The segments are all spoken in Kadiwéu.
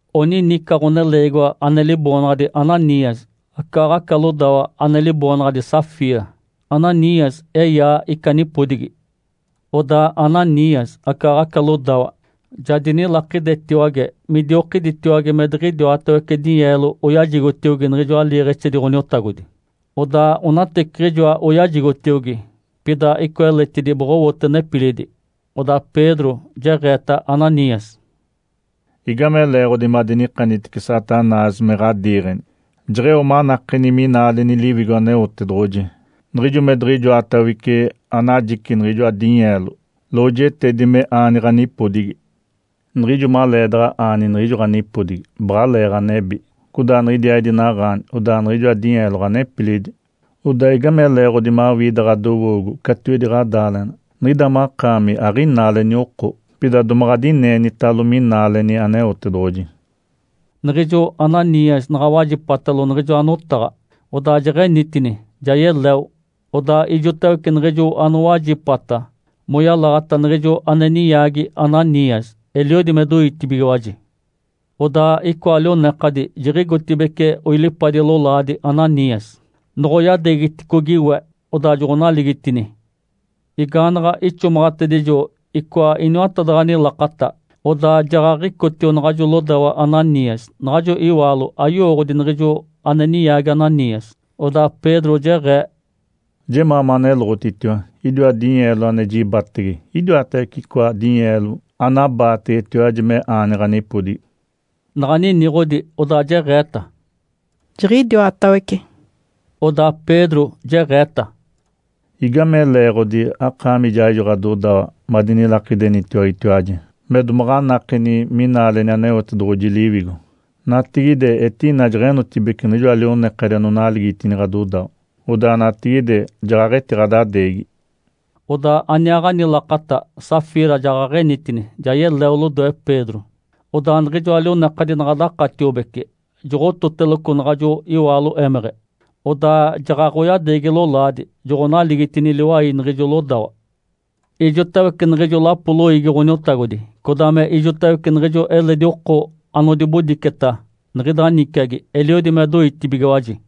Onini ica ɡ̶oneleegiwa ane liboonaɡ̶adi Ananias, acaaɡ̶aca lodawa ane liboonaɡ̶adi Safira. Ananias eyaa ica nipodigi. Odaa Ananias acaaɡ̶aca lodawa ja dinilakidetiwage midiokiditiwage me diɡ̶idiwatawece dinyeelo oyajigotiogi niɡ̶ijoa liiɡ̶exedi Ǥoniotagodi, odaa onateciɡ̶ijoa oyajigotiogi, pida icoa eletidi boɡ̶owote nepilidi. Odaa Pedro jeɡ̶eeta Ananias, “Igame leeɡ̶odi madinikanitece Satanás me ɡ̶adiiɡ̶eni? Jeɡ̶eo manakeni minaaleni Liwigo Aneotedoɡ̶oji niɡ̶ijo me diɡ̶ijoatawece anajici niɡ̶ijoa dinyeelo lojetedi me aani ɡ̶anipodigi. Niɡ̶ijo maleedaɡ̶a aani niɡ̶ijo ɡ̶anipodigi, baɡ̶alee ɡ̶anebi. Codaa niɡ̶idiaaɡ̶idi naɡ̶aani, odaa niɡ̶ijoa dinyeelo ɡ̶anepilidi. Odaa igame leeɡ̶odi mawii ida ɡ̶adowoogo catiwedi ɡ̶adaaleɡ̶ena? Niɡ̶ida makaami aɡ̶inaaleni oko, pida domaɡ̶a adineenitalo minaaleni Aneotedoɡ̶oji.” Niɡ̶ijo Ananias naɡ̶a wajipatalo niɡ̶ijoa notaɡ̶a, odaa jeɡ̶enitini, ja yeleo. Odaa ijotawece niɡ̶ijo anowajipata moyalaɡ̶ata niɡ̶ijo ane ninyaagi Ananias eliodi me doitibigiwaji. Odaa icoa lionekadi jiɡ̶igotibeci oilipadi lolaadi Ananias. Noɡ̶oyadeegiticogi we, odaa joɡ̶onaligitini. Igaanaɡ̶a ixomaɡ̶atedijo icoa iniwatadaɡ̶ani lakata, odaa jaɡ̶aɡ̶icotio naɡ̶ajo lodawa Ananias. Naɡ̶ajo iwaalo ayowooɡ̶odi niɡ̶ijo ane ninyaagi Ananias. Odaa Pedro jeɡ̶ee, “Jemaa maneloɡ̶otitiwa! Idiwa dinyeelo ane jibatege, idiwatawece icoa dinyeelo anabaategetiwaji me aani ɡ̶anipodigi?” Naɡ̶a niniɡ̶odi, odaa jeɡ̶eeta, “Jiɡ̶idiwatawece!” Odaa Pedro jeɡ̶eeta, “Igame leeɡ̶odi akaami ijaaɡ̶ijo ɡ̶adodawa madinilakidenitiwagetiwaji me domaɡ̶a anakeni minaaleni Aneotedoɡ̶oji Liwigo? Natigide etina jeɡ̶enotibeci niɡ̶ijoa lionekadi anonaligitini ɡ̶adodawa. Odaa natigide jaɡ̶aɡ̶etiɡ̶adadeegi.” Odaa aniaaɡ̶ani lakata Safira jaɡ̶aɡ̶enitini, ja yeleo lodoe Pedro. Odaa niɡ̶ijoa lionekadi naɡ̶a dakatiobece, joɡ̶ototeloco naɡ̶ajo iwaalo émeɡ̶e. Odaa jaɡ̶aɡ̶oyadeegi lolaadi, joɡ̶onaligitini liwai niɡ̶ijo lodawa. Ijotawece niɡ̶ijo lapo loiigi Ǥoniotagodi codaa me ijotawece niɡ̶ijo eledi oko anodibodiceta niɡ̶ida niciagi eliodi me doitibigiwaji.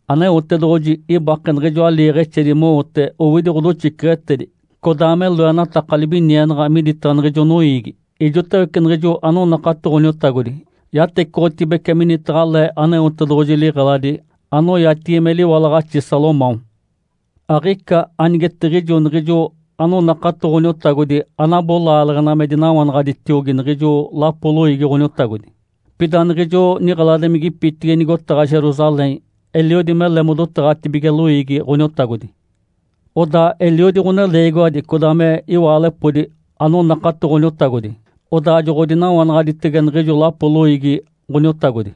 Aneotedoɡ̶oji ibake niɡ̶ijoa liiɡ̶exedi mowote owidi ɡ̶odoxiceɡ̶etedi codaa me loenataka libinienaɡ̶a miditaɡ̶a niɡ̶ijo noiigi. Ijotawece niɡ̶ijo anonakato Ǥoniotagodi yatecoɡ̶otibece minitaɡ̶a le Aneotedoɡ̶oji liɡ̶eladi anoyatigi me “Liwalaɡ̶axi Salomão”. Aɡ̶ica anigetiɡ̶ijo niɡ̶ijo ane doɡ̶onakatoteda Ǥoniotagodi anabo laaleɡ̶ena me dinawanaɡ̶aditiogi niɡ̶ijo lapo loiigi Ǥoniotagodi. Pida niɡ̶ijo niɡ̶eladimigipitigi nigotaɡ̶a Jerusalém eliodi mele modotaɡ̶atibige loiigi Ǥoniotagodi. Odaa eliodi ɡ̶oneleegiwadi codaa me iwaalepodi anonakato Ǥoniotagodi, odaa joɡ̶odinawanaɡ̶aditege niɡ̶ijo lapo loiigi Ǥoniotagodi.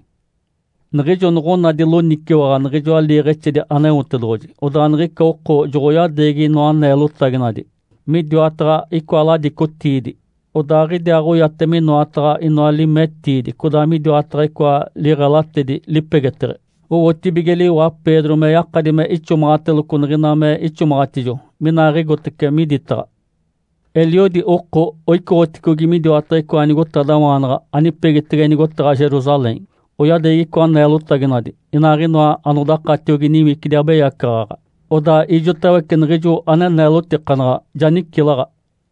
Niɡ̶ijo noɡ̶onadi loniciwaɡ̶a niɡ̶ijoa liiɡ̶exedi Aneotedoɡ̶oji, odaa niɡ̶ica oko joɡ̶oyadeegi inoa neelotaginadi midiwataɡ̶a icoa ladicotiidi. Odaaɡ̶idiaaɡ̶oyate minoataɡ̶a inoa limetiidi codaa midiwataɡ̶a icoa liɡ̶elatedi lipegeteɡ̶e. Owotibige liwa Pedro me yakadi me ixomaɡ̶ateloco niɡ̶ina me ixomaɡ̶atijo, minaaɡ̶igotece miditaɡ̶a. Eliodi oko oicoɡ̶oticogi midiwataɡ̶a icoa nigotadawaanaɡ̶a anipegitege nigotaɡ̶a Jerusalém, oyadeegi icoa neelotaginadi, inaaɡ̶inoa anodakatiogi niwicidi abeyacaɡ̶aɡ̶a. Odaa ijotawece niɡ̶ijo ane neelotikanaɡ̶a ja nicilaɡ̶a.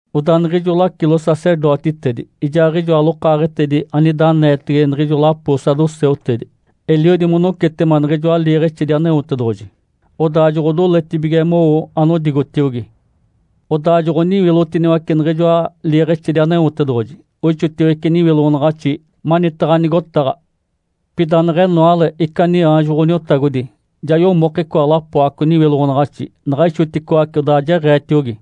Odaa niɡ̶ijo lacilo-sacerdotitedi ijaaɡ̶ijoa lokaaɡ̶etedi anida aneetege niɡ̶ijo lapo saduceutedi eliodi monocetema niɡ̶ijoa liiɡ̶exedi Aneotedoɡ̶oji, odaa joɡ̶odoletibige mowo anodigotiogi. Odaa joɡ̶oniwilotiniwace niɡ̶ijoa liiɡ̶exedi Aneotedoɡ̶oji, oixotiwece niwiloɡ̶onaɡ̶axi manitaɡ̶a nigotaɡ̶a. Pida neɡ̶enoale ica niaanjo Ǥoniotagodi ja yomoke icoa lapoaco niwiloɡ̶onaɡ̶axi, naɡ̶a ixoticoace, odaa jeɡ̶eetiogi,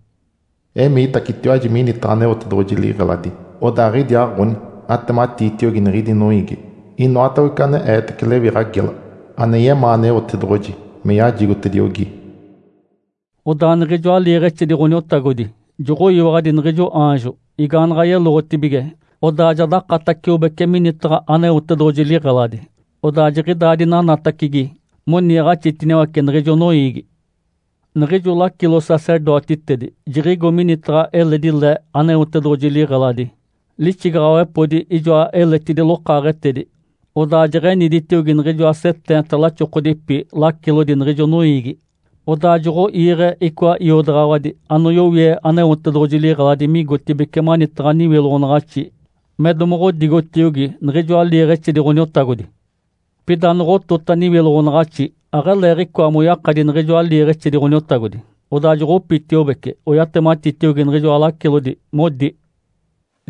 “Emiitacetiwaji minitaɡ̶a Aneotedoɡ̶oji liɡ̶eladi, odaaɡ̶idiaaɡ̶oni atematiitiogi niɡ̶idi noiigi inoatawece ane eetece lewiɡ̶a gela ane yemaa Aneotedoɡ̶oji me yajigotediogi.” Odaa niɡ̶ijoa liiɡ̶exedi Ǥoniotagodi joɡ̶oyiwaɡ̶adi niɡ̶ijo aanjo. Igaanaɡ̶a yeloɡ̶otibige, odaa ja dakataciobece minitaɡ̶a Aneotedoɡ̶oji liɡ̶eladi, odaa jiɡ̶idaa dinanatacigi moniiɡ̶axitiniwace niɡ̶ijo noiigi. Niɡ̶ijo lacilo-sacerdotitedi jiɡ̶igo minitaɡ̶a eledi le Aneotedoɡ̶oji liɡ̶eladi lixigaɡ̶awepodi ijoa eletidi lokaaɡ̶etedi, odaa jeɡ̶eniditiogi niɡ̶ijoa seteenta laxokodipi lacilodi niɡ̶ijo noiigi. Odaa joɡ̶oiiɡ̶e icoa iodaɡ̶awadi anoyowie Aneotedoɡ̶oji liɡ̶eladi migotibeci manitaɡ̶a niwiloɡ̶onaɡ̶axi me domoɡ̶odigotiogi niɡ̶ijoa liiɡ̶exedi Ǥoniotagodi. Pida noɡ̶otota niwiloɡ̶onaɡ̶axi, aɡ̶aleeɡ̶icoa moyakadi niɡ̶ijoa liiɡ̶exedi Ǥoniotagodi. Odaa joɡ̶opitiobeci, oyatematitiogi niɡ̶ijoa lacilodi, modi,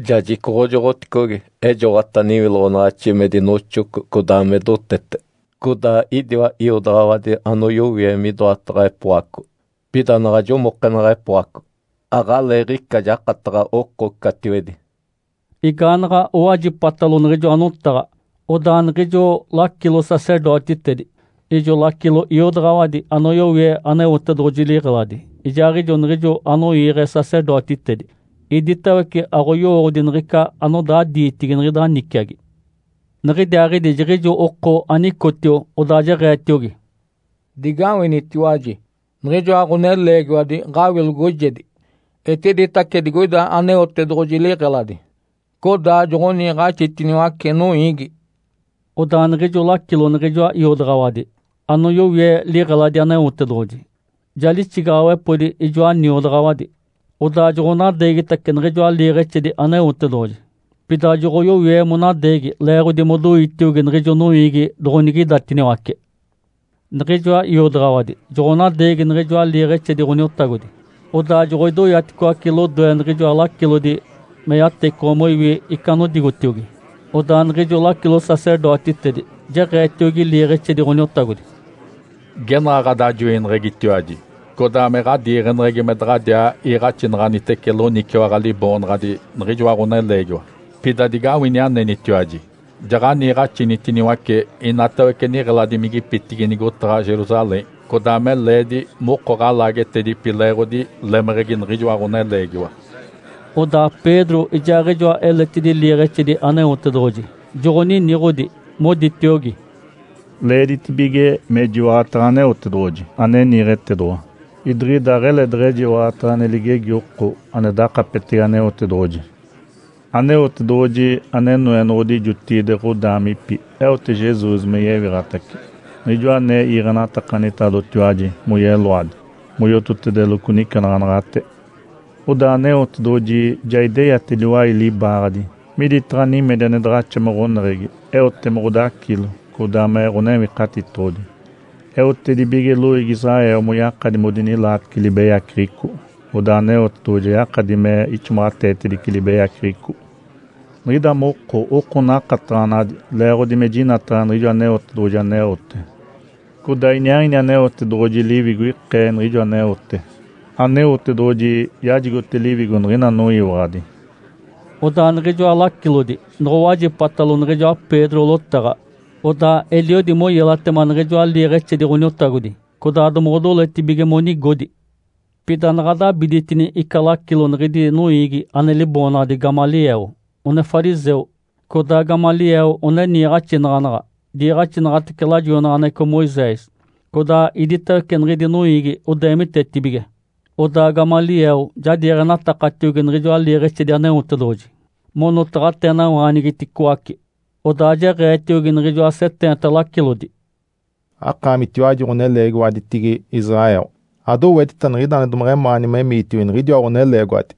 “Ja jicoɡ̶ojoɡ̶oticogi, ejoɡ̶ota niwiloɡ̶onaɡ̶axi me dinoxoco codaa me dotete. Codaa idiwa iodaɡ̶awadi anoyowie midoataɡ̶a epoaco. Pida naɡ̶a jomokenaɡ̶a epoaco, aɡ̶aleeɡ̶ica jakataɡ̶a oko catiwedi.” Igaanaɡ̶a owajipatalo niɡ̶ijoa notaɡ̶a, odaa niɡ̶ijo lacilo-sacerdotitedi, ijo lacilo iodaɡ̶awadi anoyowie Aneotedoɡ̶oji liɡ̶eladi, ijaaɡ̶ijo niɡ̶ijo anoiiɡ̶e sacerdotitedi, iditawece aɡ̶oyowooɡ̶odi niɡ̶ica anodaa diitigi niɡ̶ida niciagi. Niɡ̶idiaaɡ̶idi jiɡ̶ijo oko anicotio, odaa jeɡ̶eetiogi, “Digawinitiwaji! Niɡ̶ijoa ɡ̶oneleegiwadi ɡ̶awilogojedi etiditace digoida Aneotedoɡ̶oji liɡ̶eladi, codaa joɡ̶oniiɡ̶axitiniwace noiigi.” Odaa niɡ̶ijo lacilo niɡ̶ijoa iodaɡ̶awadi anoyowie liɡ̶eladi Aneotedoɡ̶oji ja lixigaɡ̶awepodi ijoa niodaɡ̶awadi, odaa joɡ̶onadeegitace niɡ̶ijoa liiɡ̶exedi Aneotedoɡ̶oji, pida joɡ̶oyoe monadeegi leeɡ̶odi modoitiogi niɡ̶ijo noiigi doɡ̶onigidatiniwace. Niɡ̶ijoa iodaɡ̶awadi joɡ̶onadeegi niɡ̶ijoa liiɡ̶exedi Ǥoniotagodi, odaa joɡ̶odoyaticoace lodoe niɡ̶ijoa lacilodi me yatecoɡ̶o moiwi ica anodigotiogi. Odaa niɡ̶ijo lacilo-sacerdotitedi jeɡ̶eetiogi liiɡ̶exedi Ǥoniotagodi, “Genaɡ̶a ɡ̶adajoineɡ̶egitiwaji codaa me ɡ̶adiiɡ̶eneɡ̶egi me daɡ̶adiaa iiɡ̶axinaɡ̶anitece loniciwaɡ̶a liboonaɡ̶adi niɡ̶ijoa ɡ̶oneleegiwa. Pida digawini anenitiwaji! Ja ɡ̶aniiɡ̶axinitiniwace inatawece niɡ̶eladimigipitigi nigotaɡ̶a Jerusalém codaa me leedi moko ɡ̶alaagetedipi leeɡ̶odi lemeɡ̶egi niɡ̶ijoa ɡ̶oneleegiwa.” Odaa Pedro ijaaɡ̶ijoa eletidi liiɡ̶exedi Aneotedoɡ̶oji joɡ̶oniniɡ̶odi, moditiogi, “Leeditibige mejiwaɡ̶ataɡ̶a Aneotedoɡ̶oji ane niiɡ̶etedoɡ̶owa, idiɡ̶ida aɡ̶ele deɡ̶ejiwaɡ̶ataɡ̶a ane ligegi oko ane dakapetege Aneotedoɡ̶oji. Aneotedoɡ̶oji ane Noenoɡ̶odi jotigide ɡ̶odaamipi eote Jesus me yewiɡ̶atace, Niɡ̶ijoa ane iiɡ̶enatakanitalotiwaji moyeloadi moyototedeloco nicenaɡ̶anaɡ̶ate. Odaa Aneotedoɡ̶oji ja ideyate liwai libaaɡ̶adi miditaɡ̶a nimedi ane daɡ̶axa me ɡ̶oneɡ̶egi eote me Ǥodacilo codaa me Ǥonewikatitoɡ̶odi, eotedibige loiigi Israel moyakadi modinilaatece libeyaceɡ̶eco, odaa Aneotedoɡ̶oji ja yakadi me ixomaɡ̶ateetedice libeyaceɡ̶eco. Niɡ̶ida moko oko nakataɡ̶anadi leeɡ̶odi me jinataɡ̶a niɡ̶ijo Aneotedoɡ̶oji aneote, codaa iniaaɡ̶ini Aneotedoɡ̶oji Liwigo ikee niɡ̶ijo aneote. Aneotedoɡ̶oji yajigote Liwigo niɡ̶ina anoyiwaɡ̶adi.” Odaa niɡ̶ijoa lacilodi noɡ̶owajipatalo niɡ̶ijoa Pedro lotaɡ̶a, odaa eliodi moyelatema niɡ̶ijoa liiɡ̶exedi Ǥoniotagodi, codaa domoɡ̶odoletibige monigodi. Pida naɡ̶a dabiditini ica lacilo niɡ̶idi noiigi ane liboonaɡ̶adi Gamaliel, one fariseu. Codaa Gamaliel one niiɡ̶axinaɡ̶anaɡ̶a diiɡ̶axinaɡ̶atece lajoinaɡ̶aneɡ̶eco Moisés, codaa iditawece niɡ̶idi noiigi odeemitetibige. Odaa Gamaliel ja diiɡ̶enatakatiogi niɡ̶ijoa liiɡ̶exedi Aneotedoɡ̶oji monotaɡ̶ateenawaanigiticoace. Odaa jeɡ̶eetiogi niɡ̶ijoa seteenta lacilodi, “Akaamitiwaji ɡ̶oneleegiwaditigi Israel, adowetita niɡ̶ida ane domeɡ̶emaani memiitiogi niɡ̶idiwa ɡ̶oneleegiwadi!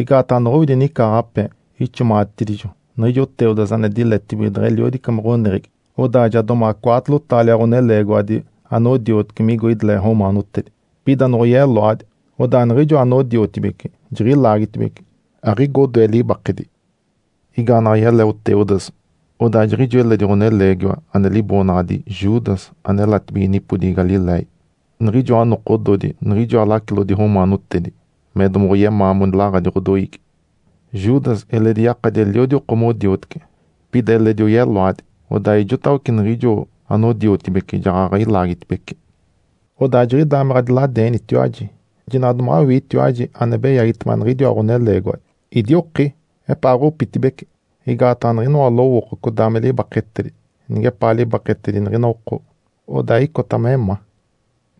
Igaataɡ̶a anoɡ̶owidi nicaaɡ̶ape ixomaɡ̶atedijo niɡ̶ijo Teudas ane diletibige deɡ̶eliodi me ɡ̶oneɡ̶egi. Odaa ja domaɡ̶a cwaatolo taalia ɡ̶oneleegiwadi anodioteci migo ideleɡ̶e romaanotedi. Pida noɡ̶oyeloadi, odaa niɡ̶ijo anodiotibeci jiɡ̶ilaagitibece, aɡ̶igo odoe libakedi. Igaanaɡ̶a yeleo Teudas, odaa jiɡ̶ijo eledi ɡ̶oneleegiwa ane liboonaɡ̶adi Judas ane elatibige nipodigi Galiléia. Niɡ̶ijoa nokododi, niɡ̶ijoa lacilodi romaanotedi me domoɡ̶oyemaa monilaɡ̶adi ɡ̶odoiigi. Judas eledi yakadi eliodi oko modioteci. Pida eledi oyeloadi, odaa ijotawece niɡ̶ijo anodiotibeci jaɡ̶aɡ̶a ilaagitibece. Odaa jiɡ̶idaa me ɡ̶adiladeenitiwaji. Jinaɡ̶a domaɡ̶awiitiwaji ane beyagitema niɡ̶idiwa ɡ̶oneleegiwadi. Idioki, epaaɡ̶opitibece! Igaataɡ̶a niɡ̶inoa lowooko codaa me libaketedi nigepaa libaketedi niɡ̶ina oko, odaa icota me ma.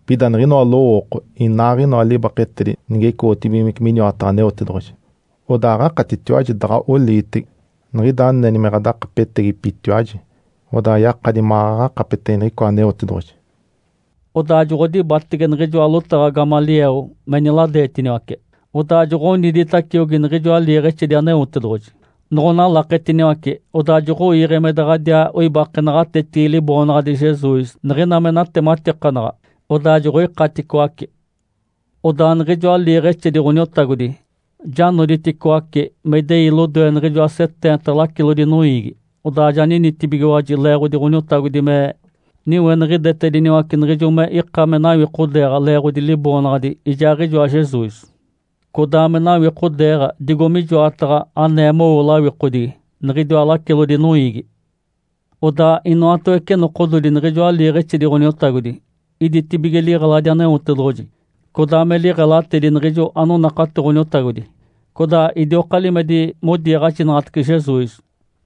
Pida niɡ̶inoa lowooko inaaɡ̶inoa libaketedi nige icoɡ̶otedibigimece miniwataɡ̶a Aneotedoɡ̶oji, odaa aɡ̶akatitiwaji daɡ̶a oliitege. Niɡ̶ida aneni me ɡ̶adakapetegipitiwaji, odaa yakadi maɡ̶aɡ̶a akapetege niɡ̶icoa Aneotedoɡ̶oji.” Odaa joɡ̶odibatege niɡ̶ijoa lotaɡ̶a Gamaliel me niladeetiniwace. Odaa joɡ̶oniditaciogi niɡ̶ijoa liiɡ̶exedi Aneotedoɡ̶oji, noɡ̶onalaketiniwace, odaa joɡ̶oiiɡ̶e me daɡ̶adiaa oibake naɡ̶atetigi Liboonaɡ̶adi Jesus niɡ̶ina me natematikanaɡ̶a. Odaa joɡ̶oikaticoace. Odaa niɡ̶ijoa liiɡ̶exedi Ǥoniotagodi ja noditicoaci me idei lodoe niɡ̶ijoa seteenta lacilodi noiigi. Odaa ja ninitibigiwaji leeɡ̶odi Ǥoniotagodi me niweniɡ̶idetediniwace niɡ̶ijo me ika me nawikodeeɡ̶a leeɡ̶odi Liboonaɡ̶adi ijaaɡ̶ijoa Jesus, codaa me nawikodeeɡ̶a digo mijoataɡ̶a anee mowo lawikodigi niɡ̶idiwa lacilodi noiigi. Odaa inoatawece nokododi niɡ̶ijoa liiɡ̶exedi Ǥoniotagodi iditibige liɡ̶eladi Aneotedoɡ̶oji, codaa me liɡ̶elatedi niɡ̶ijo anonakato Ǥoniotagodi, codaa idioka limedi modiiɡ̶axinaɡ̶atece Jesus,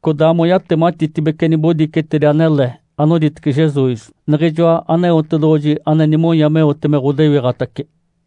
codaa moyatematitedibece nibodicetedi anele anoditece Jesus, Niɡ̶ijoa Aneotedoɡ̶oji ane nimonya meote me ɡ̶odewiɡ̶atace.